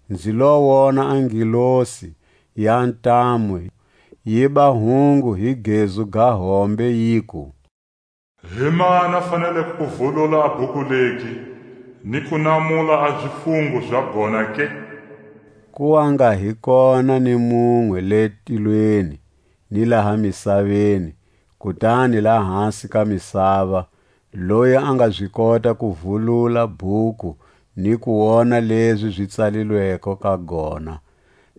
Nzi lo wona a ngelosi ya ntamu yiba hungu hi gezu ga hombe, yiku: Himani a faneleko ku vulula a bhuku legi, ni ku namula a zifungo za gona ke? Ku wa nga hi kona ni munwe le tilweni, ni laha misaveni, kutani lahasi ka misava, loyi a nga zi kota ku vulula bhuku, ni ku wona lezi zi tsalilweko ka gona.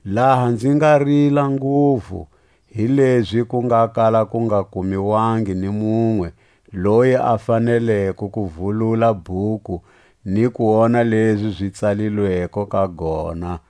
Laha nzi nga rila nguvu, hilezi ku nga kala ku nga kumiwangi ni munwe loyi a faneleko ku vulula bhuku ni ku wona lezi zi tsalilweko ka gona,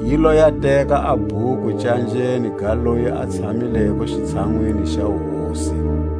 Yi lo ya teka a bhuku canjeni ga loyi a tshamileko xitshanwini xa wuhosi.